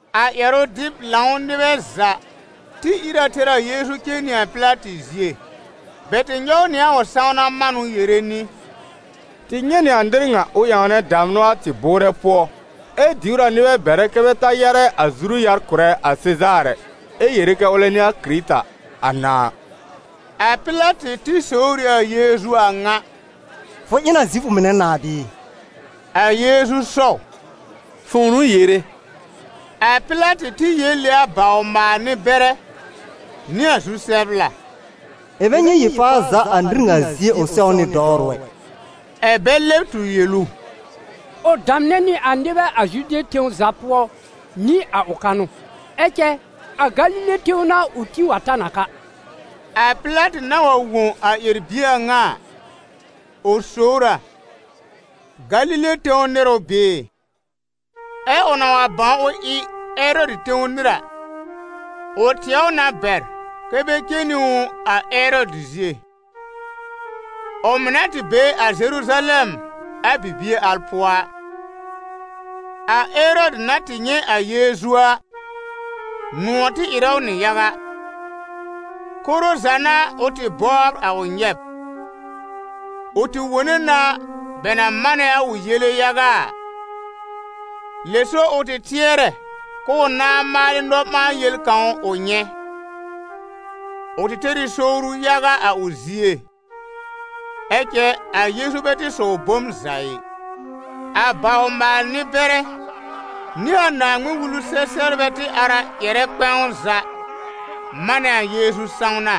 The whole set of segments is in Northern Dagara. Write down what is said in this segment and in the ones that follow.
A ƴɛrʋ-dɩb-lãw nɩbɛ za tɩ ír a tɛr a Yeezu cen nɩ a Pɩlatɩ zie. Bɛ tɩ nyɔw nɩ a ʋ sãwna manʋ yere nɩ: «Tɩ nyɛ̃ nɩ a nɩr ŋa ʋ ƴãwnɛ damnʋ a tɩ bʋʋrɛ pʋɔ, ɛ diwr a nɩbɛ bɛrɛ kɛ bɛ ta yarɛ a zuru-yar kʋ̀rɛ a Sezaar ɛ, ɛ yere kɛ ʋlɛ n'ɩ a Kɩrɩta, a Nãà.» A Pɩlatɩ tɩ sowr ɩ a Yeezu a ŋa: «Fʋ ɩ n a Zifʋ mɩnɛ nãà bɩɩ?» A Yeezu sɔw: «Fʋ̃ʋ n'ʋ yere.» A Pɩlatɩ tɩ yel ɩ a bawr-maal-nɩ-bɛrɛ nɩ a zu-sɛbla: «Ɩ̃ bɛ nyɛ̃ yel-faa za a nɩr ŋa zie ʋ sɛwnɩ dɔwrʋ ɛ.» Ɛ̀ bɛ lɛb tur yel ʋ: «Ʋ damnɛ nɩ a nɩbɛ a Zude tẽw za pʋɔ nɩ a ʋ kanʋ, ɛ cɛ a Galile tẽw n'a ʋ tĩ wa ta n a ka.» A Pɩlatɩ na wa wõ a ƴɛr-bie a ŋa a, ʋ sowr a: «Galile tẽw nɩr ʋ bɩɩ?» Ɛ ʋ na wa bãw ʋ ɩ Erɔdɩ tẽw nɩr a, ʋ tɩɛ ʋ na bɛr kɛ́ bɛ cen nɩ ʋ a Erɔdɩ zie, ʋ mɩ̀ na tɩ be a Zeruzalɛm a bibie al pʋɔ a. A Erɔdɩ na tɩ nyɛ̃ a Yeezu a, nʋ̃ɔ̀ tɩ ɩrɛ ʋ nɩ yaga. Koro za n'a ʋ tɩ bɔbr a ʋ nyɛb. Ʋ tɩ wone na bɛ na manɛ a ʋ yele yaga a, lɛ so ʋ tɩ tɩɛrɛ k'ʋʋ nãá maalɩ nɔ-ɓãa-yel kãw ʋ nyɛ̃. Ʋ tɩ tɛr ɩ sowru yaga a ʋ zie, ɛ cɛ a Yeezu bɛ tɩ sɔw bom za ɩ. A bawr-maal-nɩ-bɛrɛ, nɩ a Naaŋmɩn-Wulu-sɛ-sɛbrbɛ tɩ ar a ƴɛrɛ kpɛ̃w za manɛ a Yeezu sãwna.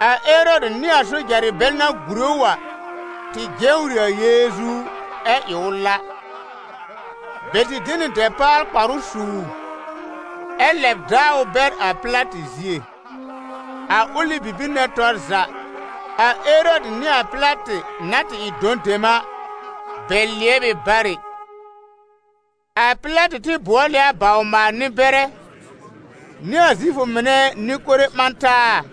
A Erɔdɩ nɩ a sojarɩ bɛl na gùre ʋ a, tɩ jewr ɩ a Yeezu, ɛ ɩ ʋ la. Bɛ tɩ de nɩ dɛpaal-kparʋ su ʋ, ɛ lɛb daa ʋ bɛr a Pɩlatɩ zie. A ʋlɩ bibir nɛ tɔr za, a Erɔdɩ nɩ a Pɩlatɩ na tɩ ɩ dɔ̃ dem a, bɛ lɩɛb ɩ barɩ. A Pɩlatɩ tɩ bʋɔl ɩ a bawr-maal-nɩ-bɛrɛ nɩ a Zifʋ mɩnɛ nɩ-kore ɓã taa,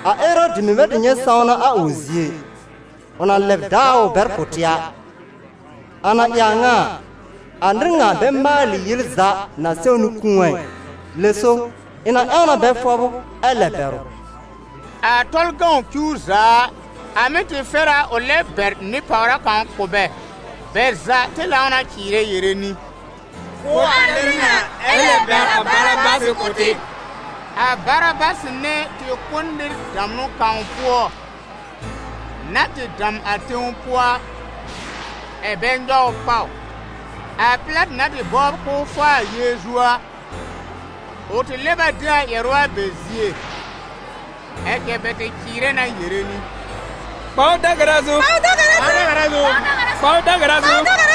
A Erɔdɩ mɩ̀ bɛ tɩ nyɛ̃ sãwna a ʋ zie ɩ, ʋ na lɛb daa ʋ bɛr kʋ̀ tɩ a. A na ɩ a ŋa a, a nɩr ŋa bɛ maalɩ yel za na sɛwnɩ kũu a ɩ. Lɛ so, ɩ̃ na ƴãw na bɛ fɔb ʋ ɛ lɛb bɛr ʋ.» [ A Tɔlʋ cuw za a, a mɩ́ tɩ fɛr a ʋ lɛb bɛr nɩ-pàwra kãw kʋ̀ bɛ.] Bɛ za tɩ lãw na cɩɩrɛ yere nɩ: «Kʋ́ a nɩr ŋa! Ɛ lɛb bɛr a Barabasɩ kʋ̀ tɩ!» A Barabasɩ nɛ tɩ kʋ́ n nɩr damnʋ kãw pʋɔ na tɩ dam a tẽw pʋɔ a, ɛ̀ bɛ nyɔw ʋ pàw. A Pɩlatɩ na tɩ bɔbr k'ʋʋ faa a Yeezu a, ʋ tɩ lɛb a de a ƴɛrʋ a bɛ zie. Ɛ cɛ bɛ tɩ cɩɩrɛ na yere nɩ: «Kpa ʋ da-gara zu! Kpa ʋ da-gara zu!»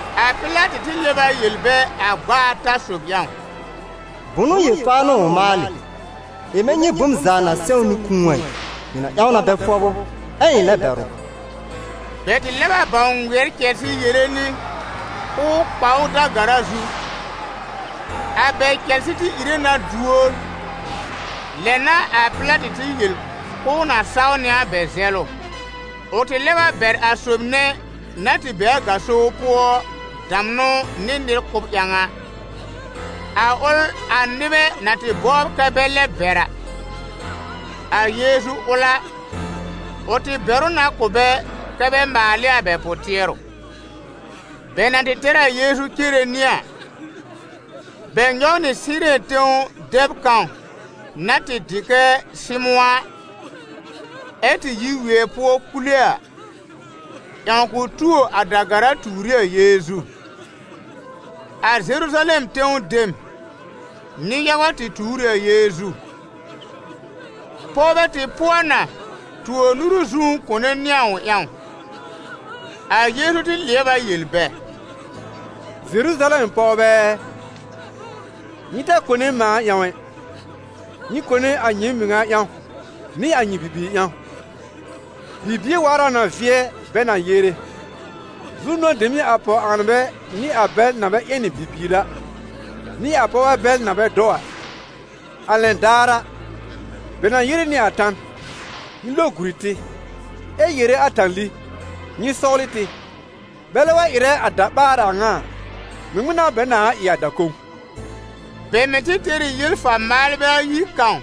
A Pɩlatɩ tɩ lɛb a yel bɛ a gb'a ata sob ƴãw: «Bʋ̃nʋ yel-faa n'ʋ ʋ maalɩ? Ɩ̃ bɛ nyɛ̃ bom za na sɛwnɩ kũu a ɩ. Ɩ̃ na ƴãw na bɛ fɔb ʋ, ɛ ɩ̃ lɛb bɛr ʋ.» Bɛ tɩ lɛb a bãw ŋmɩɛr cɛlsɩ yere nɩ k'ʋʋ kpa ʋ da-gara zu. A bɛ cɛlsɩ tɩ ire na duor. Lɛ n'a a Pɩlatɩ tɩ yel k'ʋʋ na saw nɩ a bɛ zɛlʋ. Ʋ tɩ lɛb a bɛr a sob nɛ na tɩ be a gaso pʋɔ damnʋ nɩ nɩr kʋ́b ƴãw a, a ʋl a nɩbɛ na tɩ bɔbr kɛ bɛ lɛ bɛr a. A Yeezu ʋl a, ʋ tɩ bɛr ʋ na kʋ̀ bɛ kɛ bɛ maal ɩ a bɛ pʋ-tɩɛrʋ. Bɛ na tɩ tɛr a Yeezu cere nɩ a, bɛ nyɔw nɩ Sɩɩrɛn tẽw dɛb kãw na tɩ dɩ kɛ Sɩmʋ̃ a, ɛ tɩ yi wɩɛ pʋɔ kule a, ƴãw k'ʋ tuo a da-gara tuur ɩ a Yeezu. A Zeruzalɛm tẽw dem nɩ-yaga tɩ tuur ɩ a Yeezu. Pɔwbɛ tɩ pʋɔ na tuo nuru zũú kone nɩ a ʋ ƴãw. A Yeezu tɩ lɩɛb a yel bɛ: «Zeruzalɛm pɔwbɛ ɛ, nyɩ ta kone mãa ƴãw ɛ! Nyɩ kone a nyɩɩm mɩŋa ƴãw, nɩ a nyɩ bibiir ƴãw. Bibie waar a na vɩɛ bɛ na yere: ‹Zu-nʋ̃ɔ̀ dem n'ɩ a pɔw-ãanbɛ nɩ a bɛl na bɛ ƴɛnɩ bibiir a, nɩ a pɔwbɛ bɛl na bɛ dɔw a!› A lɛn daar a, bɛ na yere nɩ a tan: ‹Nyɩ lo guri tɩ!› ɛ yere a tãli: ‹Nyɩ sɔwlɩ tɩ!› Bɛlɛ wa ɩrɛ a da-ɓaar a ŋa a, ŋmɩŋmɩn n'a bɛ nãa ɩ a da-kõw?» Bɛ mɩ̀ tɩ tɛr ɩ yel-fa-maalbɛ ayi kãw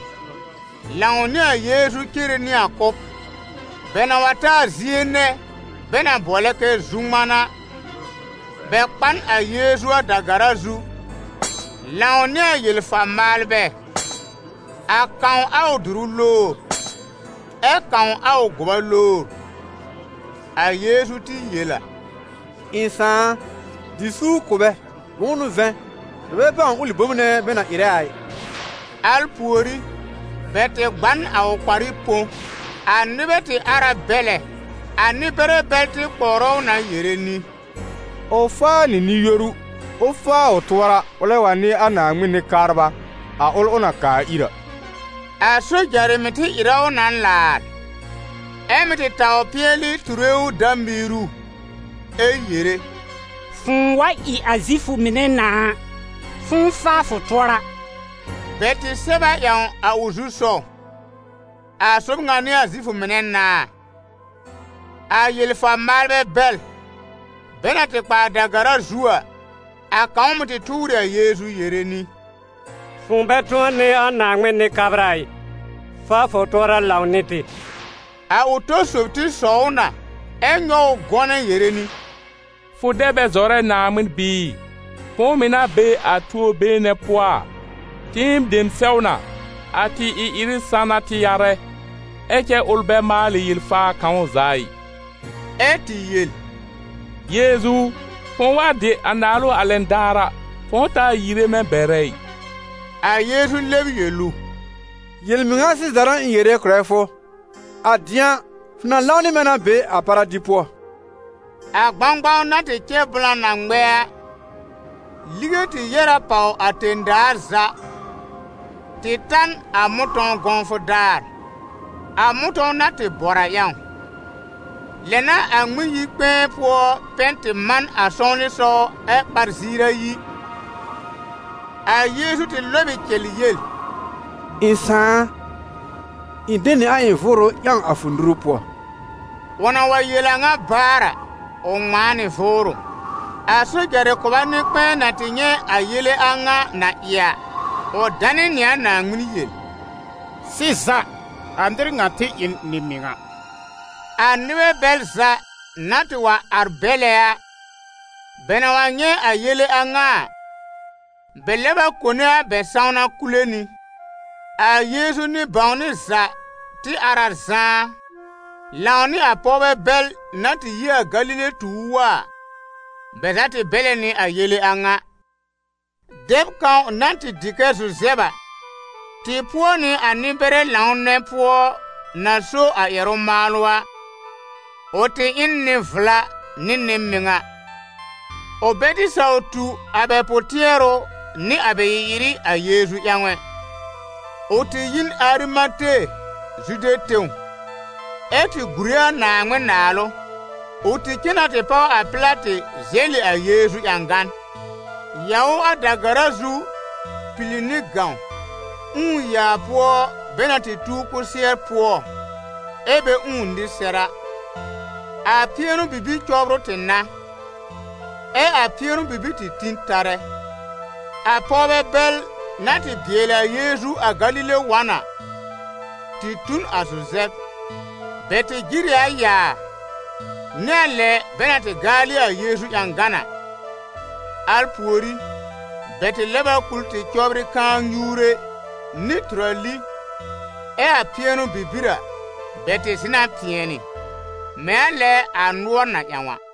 lãw nɩ a Yeezu cere nɩ a kʋ́b. Bɛ na wa ta a zie nɛ bɛ na bʋɔlɛ kɛ «Zu-ŋman» a, bɛ kpa n a Yeezu a da-gara zu, lãw nɩ a yel-fa-maalbɛ, a kãw a ʋ dʋrʋ lowr, ɛ kãw a ʋ gʋba lowr. A Yeezu tɩ yel a: «Ɩ̃ Sãà a, dɩ suur kʋ̀ bɛ: bʋ̃ʋ n'ʋ vɛ̃, bɛ bɛ bãw ʋlɩ bom nɛ bɛ na ɩrɛ a ɩ.» Al pùorí, bɛ tɩ gba n a ʋ kparɩ põ. A nɩbɛ tɩ ar a bɛlɛ. A nɩ-bɛrɛ bɛl tɩ kpɔwrɛ ʋ na yere nɩ: «Ʋ faa nɩ nɩ-yoru, ʋ faa ʋ tʋɔra, ʋlɛ wa n'ɩ a Naaŋmɩn Nɩ-kabra, a ʋl ʋ na kaa ir a.» A sojarɩ mɩ̀ tɩ ɩrɛ ʋ na laar, ɛ mɩ́ tɩ taw pɩɛlɩ ture ʋ dã-miiru ɛ yere: «Fʋ̃ʋ wa ɩ a Zifʋ mɩnɛ nãà a, fʋ̃ʋ faa fʋ tʋɔra!» Bɛ tɩ sɛb a ƴãw a ʋ zu-sɔw: «A sob ŋa n'ɩ a Zifʋ mɩnɛ nãà.» A yel-fa-maalbɛ bɛl bɛ na tɩ kpa a da-gara zu a, a kãw mɩ̀ tɩ tʋʋr ɩ a Yeezu yere nɩ: «Fʋ̃ʋ bɛ tʋ̃ɔ n'ɩ a Naaŋmɩn Nɩ-kabra ɩ? Faa fʋ tʋɔra lãw nɩ tɩ!» A ʋ tɔ sob tɩ sɔw ʋ na, ɛ nyɔw ʋ gɔnɛ yere nɩ: «Fʋ dɛ bɛ zɔrɛ a Naaŋmɩn bɩɩ? Fʋ̃ʋ mɩ̀ na be a tuo-been nɛ pʋɔ a? Tɩɩm dem sɛw na: a tɩ ɩ-ɩrɩ san n'a tɩ yarɛ. Ɛ cɛ ʋl bɛ maalɩ yel-faa kãw za ɩ.» Ɛ́ tɩ yel: «Yeezu u, fʋ̃ʋ wa dɩ a naalʋ a lɛn daar a, fʋ̃ʋ taa yiire mɛ̃ bɛrɛ ɩ.» A Yeezu lɛb yel ʋ: «Yel-mɩŋa sɩza n'a ɩ̃ yere kʋ̀rɛ fʋ, a dɩ̃a, fʋ na lãw nɩ mɛ̃ na be a paradi pʋɔ.» A gbãgbãw na tɩ cɛ blã na ŋmɛ a, lige tɩ yɛ́r a pàw a tẽ-daa za tɩ ta n a mʋ̃tɔ̃w gɔ̃wfʋ daar, a mʋ̃tɔ̃w na tɩ bɔr a ƴãw. Lɛ n'a a Ŋmɩn-yi-kpɛ̃ɛ pʋɔ pɛn tɩ man a sɔwlɩsɔw ɛ ɓar ziir ayi. A Yeezu tɩ lɔb ɩ cɛl yel: «Ɩ̃ Sãà a, ɩ̃ de nɩ a ɩ̃ vʋʋrʋ ƴãw a fʋ nuru pʋɔ.» Ʋ na wa yel a ŋa baar a, ʋ ŋmãa nɩ vʋʋrʋ. A sojarɩ kʋba nɩ-kpɛ̃ɛ na tɩ nyɛ̃ a yele a ŋa na ɩ a, ʋ danɩ nɩ a Naaŋmɩn yel: «Sɩza, a nɩr ŋa tɩ ɩ n Nɩ-mɩŋa!» A nɩbɛ bɛl za na tɩ wa ar bɛ́lɛ a, bɛ na wa nyɛ̃ a yele a ŋa a, bɛ lɛb a kone a bɛ sãwna kule nɩ. A Yeezu nɩ-bãwnɩ za tɩ ar a zãá, lãw nɩ a pɔwbɛ bɛl na tɩ yi a Galile tu ʋ wa a, bɛ za tɩ bɛ́lɛ nɩ a yele a ŋa. Dɛb kãw na tɩ dɩ kɛ Zuzɛb a, tɩ pʋɔ nɩ a nɩ-bɛrɛ lãw nɛ pʋɔ na so a ƴɛrʋ-maalʋ a. Ʋ tɩ ɩ n nɩ-vla nɩ nɩ-mɩŋa, ʋ bɛ tɩ saw tu a bɛ pʋ-tɩɛrʋ nɩ a bɛ ɩ-ɩrɩ a Yeezu ƴãw ɛ. Ʋ tɩ yi n Arimate, Zude tẽw, ɛ́ tɩ gùre a Naaŋmɩn-Naalʋ. Ʋ tɩ cen na tɩ páw a Pɩlatɩ zɛlɩ a Yeezu ƴãgan, yaw ʋ a da-gara zu pili nɩ gãw, ũù yaa pʋɔ bɛ na tɩ tuw kʋsɩɛr pʋɔ ɛ bɛ ũù nɩr sɛr a. A pɩɛnʋ-bibir cɔbrʋ tɩ n'a, ɛ a pɩɛnʋ-bibir tɩ tĩ tarɛ. A pɔwbɛ bɛl na tɩ bɩɛlɩ a Yeezu a Galile wa n a, tɩ tu n a Zuzɛb. Bɛ tɩ jɩr ɩ a yaa, nɩ a lɛ bɛ na tɩ gaalɩ a Yeezu ƴãgan a. Al pùorí, bɛ tɩ lɛb a kul tɩ cɔbrɩ kãa-nyuure nɩ tʋrali. Ɛ a pɩɛnʋ-bibir a, bɛ tɩ zɩ̃ na pɩɛnɩ, mɛ̃ a lɛ a nʋɔr na ƴãw a.